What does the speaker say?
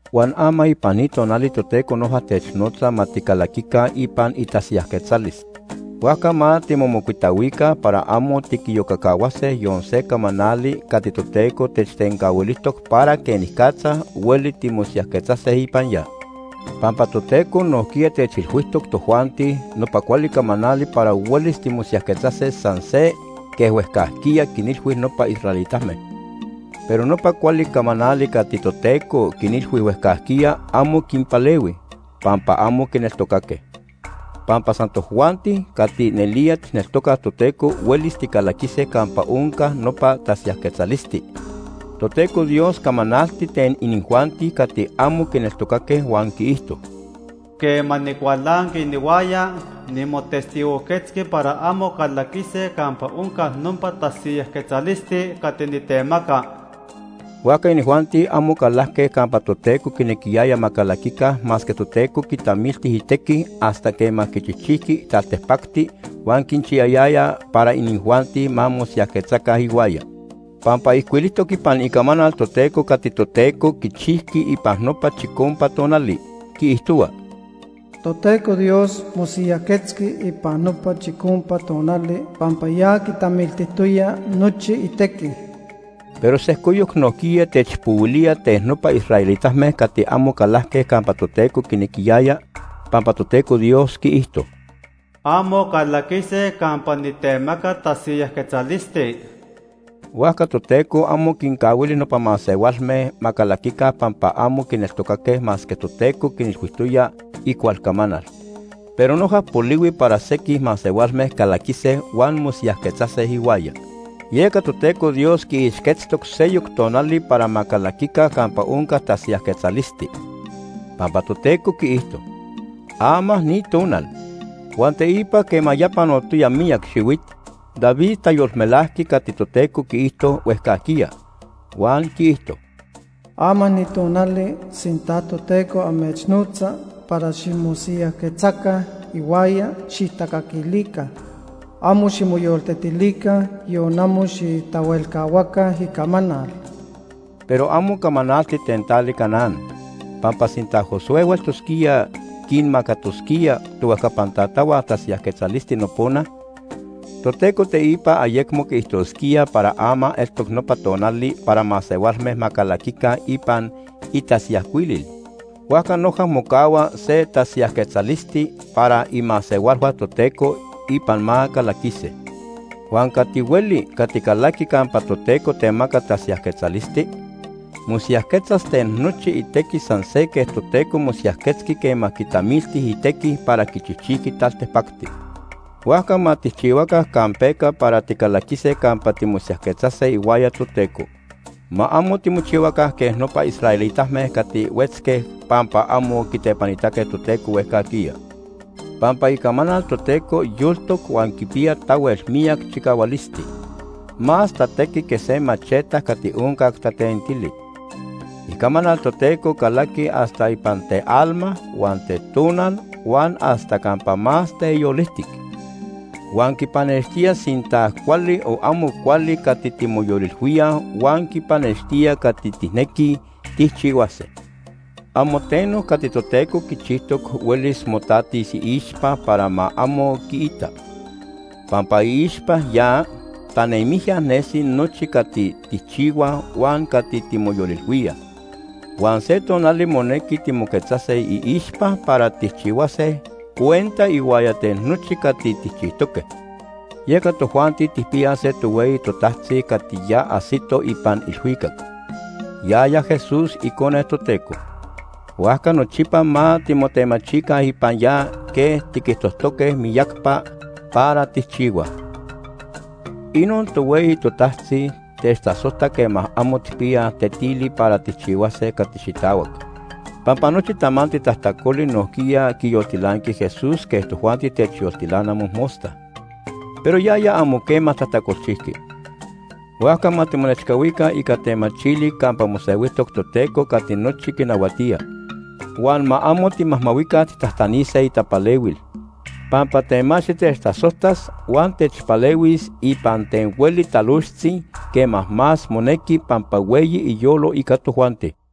Huan ama ipan ni tonali Toteco noja technotza ma ticalaquica ipan itasiyajquetzalis. Huajca ma timomocuitahuica para amo tiquiyocacahuase yon se camanali cati Toteco techtencahuilijtoc para quenicatza hueli timosiyajquetzase ipan ya. Pampa Toteco nojquiya techilhuijtoc tojuanti nopa cuali camanali para huelis timosiyajquetzase san se quej huejcajquiya quinilhui nopa israelitame. Pero nopa cuali camanali cati Toteco quinilhui huejcajquiya amo quinpalehui, pampa amo quineltocaque. Pampa san tojuanti cati nelía tijneltocaj Toteco huelis ticalaquise campa onca nopa tasiyajquetzalisti. Toteco Dios camanalti ten inijuanti cati amo quineltocaque huan quiijto: “Quema nicualanqui inihuaya, nimotestigojquetzqui para amo calaquise campa onca nopa tasiyajquetzalisti cati nitemaca.” Huajca inijuanti amo calajque campa Toteco quinequiyaya ma calaquica masque Toteco quitamilti itequi hasta quema quichijchijqui taltipacti huan quinchiyayaya para inijuanti ma mosiyajquetzaca ihuaya. Pampa ijcuilijtoc ipan Icamanal Toteco cati Toteco quichijqui ipan nopa chicompa tonali, quiijtohua: “Toteco Dios mosiyajquetzqui ipan nopa chicompa tonali pampa ya quitamiltijtoya nochi itequi.” Pero sejcoyoc nojquiya techpohuilía ten nopa israelitame cati amo calajque campa Toteco quinequiyaya, pampa Toteco Dios quiijto: “Amo calaquise campa nitemaca tasiyajquetzalisti.” Huajca Toteco amo quincahuili nopa masehualme ma calaquica pampa amo quineltocaque masque Toteco quinilhuijtoya icual camanal. Pero noja polihui para sequij masehualme calaquise huan mosiyajquetzase ihuaya. Yeca Toteco Dios quiixquetztoc seyoc tonali para ma calaquica campa onca tasiyajquetzalisti, pampa Toteco quiijto: “Ama ni tonal.” Huan teipa quema ya panotoya miyac xihuit, David tayolmelajqui cati Toteco quiijto huejcajquiya, huan quiijto: “Ama ni tonali, sinta Toteco amechnotza para ximosiyajquetzaca ihuaya, xijtacaquilica. Amo ximoyoltetilica, yon amo xijtahuelcahuaca icamanal.” Pero amo camanalti ten tali Canaán, pampa sinta Josué hueltosquía quinmacatosquía tohuejcapan tatahua tasiyajquetzalisti nopona, Toteco teipa ayecmo quiijtosquía para ama eltoc nopa tonali para masehualme ma calaquica ipan itasiyajcuilil. Huajca noja mocahua se tasiyajquetzalisti para imasehualhua Toteco ipan ma calaquise. Huan cati hueli cati calaqui campa Toteco temaca tasiyajquetzalisti, mosiyajquetzas ten nochi itequi san se quej Toteco mosiyajquetzqui quema quitamilti itequi para quichijchijqui taltipacti. Huajca ma tijchihuaca campeca para ticalaquise campa timosiyajquetzase ihuaya Toteco. Ma amo timochihuaca quej nopa israelitame cati huetzque pampa amo quitepanitaque Toteco huejcajquiya. Pampa Icamanal Toteco yoltoc huan quipiya tahuel miyac chicahualisti. Más tatequi que se macheta cati oncac tatentili. Icamanal Toteco calaqui hasta ipan tealma huan tetonal huan hasta campa más teyolijtic. Huan quipanextía sinta cuali o amo cuali cati timoyolilhuíaj huan quipanextía cati tijnequij tijchihuase. Amo teno cati Toteco quichijtoc huelis motatis iixpa para ma amo quiita, pampa iixpa ya tanemijya nesi nochi cati tijchihuaj huan cati timoyolilhuíaj. Huan se tonali monequi timoquetzase iixpa para tijchihuase cuenta ihuaya ten nochi cati tijchijtoque. Yeca tojuanti tijpiyaj se tohueyi totajtzi cati ya ajsito ipan ilhuicac, yaya Jesús, Icone Toteco. Huajca nochipa ma timotemachica ipan ya quej tiquijtojtoque miyacapa para tijchihuaj. Inon tohueyi totajtzi techtasojta quema amo tijpiyaj tetili para tijchihuase cati xitahuac, pampa nochi tamanti tajtacoli nojquiya quiyoltilanqui Jesús quej tojuanti techyoltilana mojmosta, pero yaya amo quema tajtacolchijqui. Huajca ma timonechcahuica ica temachili campa mosehuijtoc Toteco cati nochi quinahuatía. Huan ma amo timajmahuica tijtajtanise itapalehuil, pampa temachti techtasojtas huan techpalehuis ipan ten hueli talojtzi quema más monequi pampa hueyi iyolo ica tojuanti.